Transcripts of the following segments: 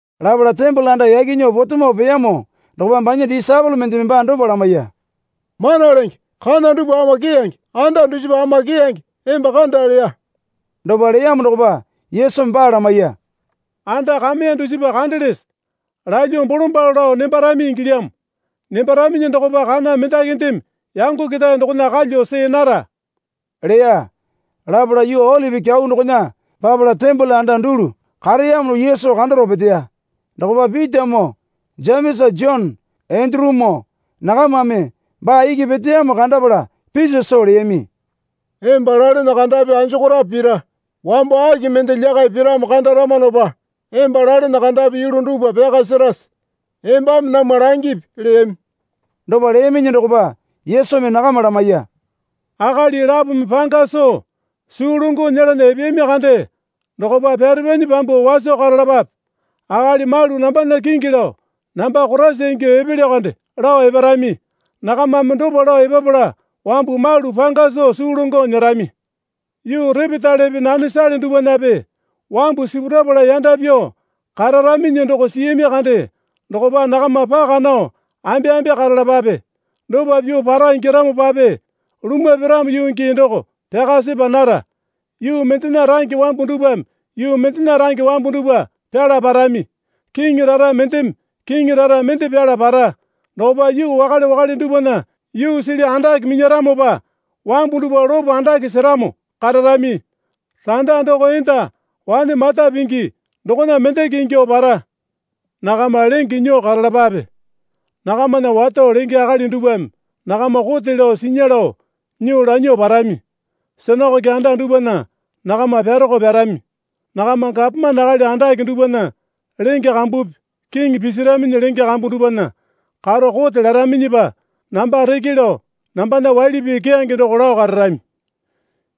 Lapala tembole anda yaki nyuo potemo peyamo dokopa banya disaepole mendeme baa dopa lamaiya. Mana Lenge, kana dupwa ama keyange, anda dusipa ama keyange emba kanda, leya. Dopa leyamo dokopa Yesumi baa lamaiya. Anda kameya dusipa kandelese? Lalyuo bolombalo lao nembarami ingilyamo. Nembaraminyi dokopa kana mendakindeme yango ketae dokona kalyuo see nara, leya. Lapala yuu Olipi Kyau dokona papala tembole anda dulu kareyamo Yesu kandaro peteya. Dokopa Pitamoo Jemesa Jone Endurumoo nakamame baa iki peteyamo kandapala piso soo leyami. Emba lalene kandapi anjokorape pira? Wambo aki mende lyakai piramo kandaramanopa emba lalene kandapi yulu dupwa pyaka serase? Embame namwa langipi, leyami. Dopa leyaminyi dokopa Yesumi nakama lamaiya. Akali lapome panga soo suu longo nyelana epeyami kande dokopa pyare pyanyi pyambuo waso karalapape. Akali malu nambana kingi lao namba Koraisa ingyuo epelyo kande lao eparami. Nakamame dopa lao epapala wambu malu panga soo suu longo nyerami. Yuu repetalepe nanesale dupwanape wambu sipurapala yanda pyuo kararaminyi doko siyami kande dokopa nakama paka nao ambeambe karalapape. Dopa pyuo para ingyaramopape lumwa piramo yuu gii doko pyaka sepa nara. Yuu mendena range wambu dupwame yuu mendena range wambu dupwa pyala parami. Kiŋi rara mendeme kiŋi rara mende pyala para. Dokopa yuu wakale wakale dupwana yuu sili andake minyaramopa wambu dupwa lopo andake seramo kararami. Randa doko enda wane mata pingi dokona mendeke ingyuo para. Nakama lenge nyuo karalapape. Nakamana wato lenge akali dupwame nakama kote lao sinya lao nyuo lanyuo parami. Sinakoke anda dupwana nakama pyaroko pyarami. Nakama gapomane akali andake dupwana lenge kambupi kiŋi pisiraminyi lenge kambu dupwana karo kote laraminyipa namba reke lao nambana waili pii keyange doko lao kararami.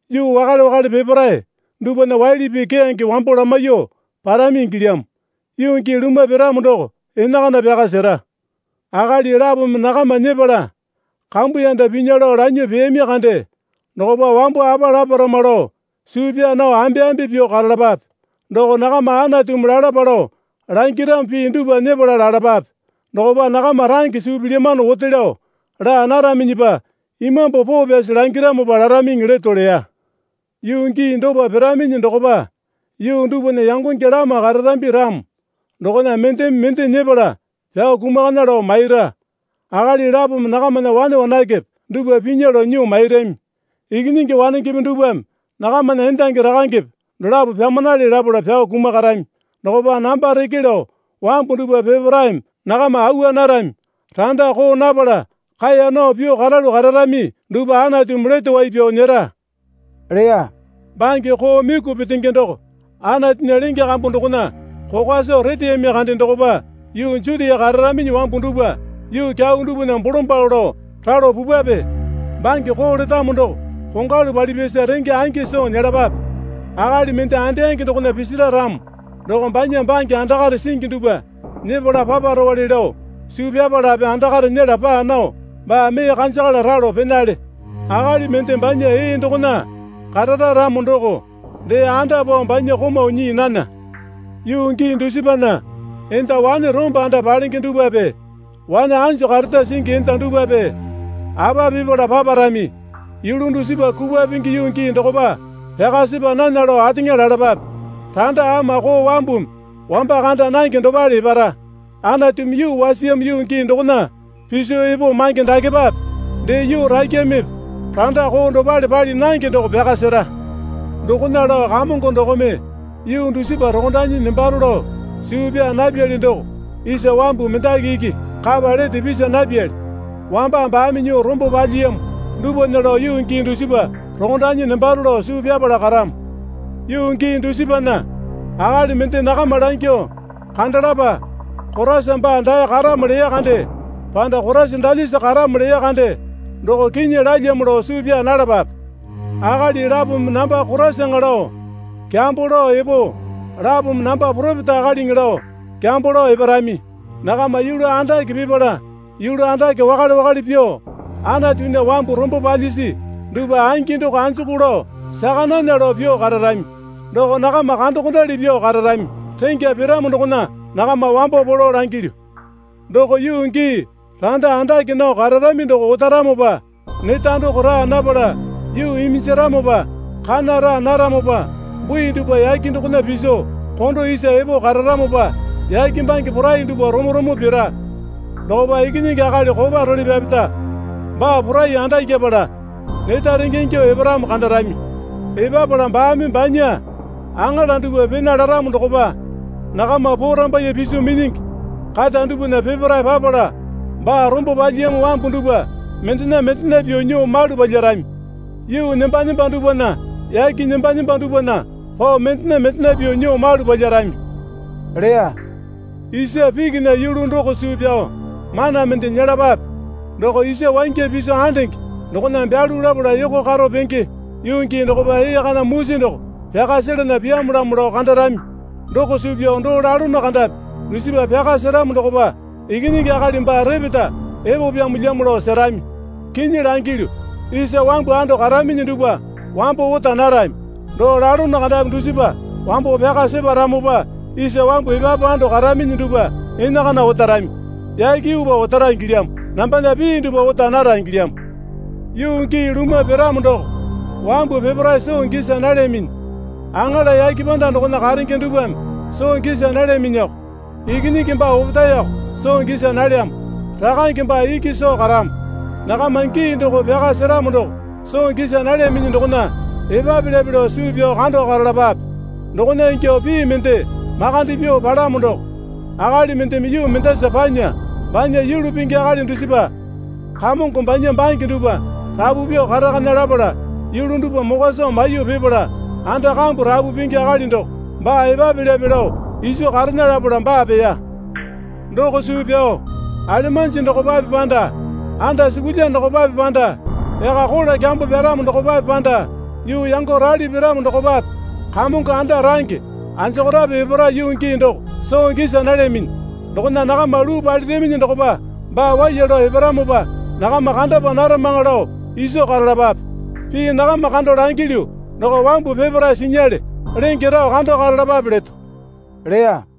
Yuu wakale wakale peparae dupwana waili pii keyange wambo lamaiyuo parami ingilyamo. Yuu gii lumwa piramo doko enakana pyaka sera. Akali lapome nakama nyepala kambuyanda pinya lao lanyuo peyami kande dokopa wambo apa laparama lao suu pyaa nao ambeambe pyuo karalapape. Doko nakama Anatumi lalapa lao langiramo pii dupwa nyepala lalapape. Dokopa nakama range suu pilyamano ote lao laa naraminyipa Imambu Poo Pyasi langiramopa laraminyi leto leya. Yuu gii dopa piraminyi dokopa yuu dupwana yangonge lama kararambi ramo dokona mendeme mende nyepala pyao kumakana lao maira. Akali lapome nakamana wane wanakepe dupwa pinya lao nyuo mairami. Ikinyingi wanengepe dupwame nakamana endangi rakangepe dolapo pyamanale lapala pyao kumakarami. Dokopa namba reke lao wambu dupwa peparaeme nakama awa narami. Randa koo napala kaeya nao pyuo karalu kararami dupwa Anatumi lete wai pyao nyera, leya. Bange koo myuku petenge doko Anatunya lenge kambu dokona kokwa soo reteyami kande dokopa yuu Jutia kararaminyi wambu dupwa yuu kyau dupwana bolombalo lao ralo pupwape. (Bange koo letamo doko kongwalu palipyasa renge angi soo nyelapape.) Akali mende andeyange dokona pisira ramo doko banya bange andakare singi dupwa nyepala paparowale lao suu pyapalape andakare nyela paa nao baa mee kanjakala ralo penale. Akali mende banya ee dokona karara ramo doko dee anda pao banya komau nyii nana. Yuu gii dusipana enda wane rombo anda palenge dupwape wane anjo kareta singi enda dupwape apa pipala paparamye. Yulu dusipa kupwa pingi yuu gii dokopa pyaka sepa nana lao ateŋa lalapape. Randa ama koo wambumi wamba kanda nange dopale epara. Anatumi yuu wasiyamo yuu gii dokona piso epo mange dakepape, dee yuu rakyamepe randa koo dopale pali nange doko pyaka sera. Dokona lao Kamongo dokome yuu dusipa rokondanyi nembaro lao suu pyaa napyali doko isa wambu mendaki iki kapa lete pisa napyali. Wamba baame nyuo rombo palyiyamo dupwana lao yuu gii dusipa rokondanyi nembaro lao suu pyapala karamo. Yuu gii dusipana akali mende nakama langyuo, Kandalapa, Koraisa baa dae karamo leya kande. Panda Koraisa dalyasa karamo leya kande. Doko kinyi lalyamo lao suu pyaa nalapape. Akali lapome namba Koraisaŋa lao kyambo lao epo lapome namba poropeta akaliŋi lao kyambo lao eparami. Nakama yulu andake pipala yulu andake wakale wakale pyuo Anatunya wambu rombo palyisi dupwa angi doko anjuku lao saka nana lao pyuo kararami. Doko nakama kandokondali pyuo kararami. Rengya piramo dokona nakama wambo polo langilyu. Doko yuu gii randa andake nao kararami doko otaramopa neta doko raa napala yuu iminjaramopa kana raa naramopa bui dupwa yake dokona piso kondo isa epo kararamopa yake bange porai dupwa romo romo pira. Dokopa Ikinyingi Akali kopa role pyapeta baa porai andakyapala neta renge ingyuo eparamo kandarami. Epapala baame banya aŋala dupwa pena laramo dokopa nakama porambaiye piso minyingi kata dupwana peparae papala baa rombo palyiyamo wambu dupwa mendena mendena pyuo nyuo malu palyarami. Yuu nemba nemba dupwana yake nemba nemba dupwana pao mendena mendena pyuo nyuo malu palyarami, leya. Isa pikinya yulu doko suu pyao mana mende nyelapape. Doko isa wangya piso andenge dokona byalu lapala yoko karo penge yuu gii dokopa ee kana musi doko pyaka selana pyamolamo lao kandarami. Doko suu pyao doo lalono kandapi dusipa pyaka seramo dokopa Ikinyingi Akali baa repeta epopyamolyamo lao serami. Kinyi langilyu, isa wambu ando karaminyi dupwa wambo ota narami. Doo lalono kandapi dusipa wambo pyaka separamopa isa wambu epapu ando karaminyi dupwa enakana otarami. Yake yuupa otara ingilyamo. Nambana pii dupwa ota nara ingilyamo. Yuu gii lumwa piramo doko wambu peparae soo gisa nalyaminyi. Aŋala yake panda dokona karenge dupwame soo gisa nalyaminyiko. Ikinyingi baa opetaeko soo gisa nalyamo. Rakange baa iki soo karamo. Nakama gii doko pyaka seramo doko soo gisa nalyaminyi dokona epapelyape lao suu pyao kando karalapape. Dokona ingyuo pii mende makande pyuo palamo doko akali mendeme yuu mendasa panya banya yulu pingi akali dusipa kamongo banya bange dupwa rapu pyuo karakana lapala yulu dupwa mokwa soo maiyuo pipala anda kambu rapu pingi akali doko baa epapelyape lao iso karena lapala baa peya. Doko suu pyao alemanji dokopape panda andasukulya dokopape panda yaka kola kyambo pyaramo dokopape panda yuu yango rali piramo dokopape kamongo anda range anjokorape epara yuu gii doko soo gisa nalyaminyi. Dokona nakama luu paliraminyi dokopa baa waiya lao eparamopa nakama kandapa naramaŋa lao iso karalapape. Pii nakama kando langilyu, doko wambu peparae sinyale. Lenge rao kando karalapape leto, leya.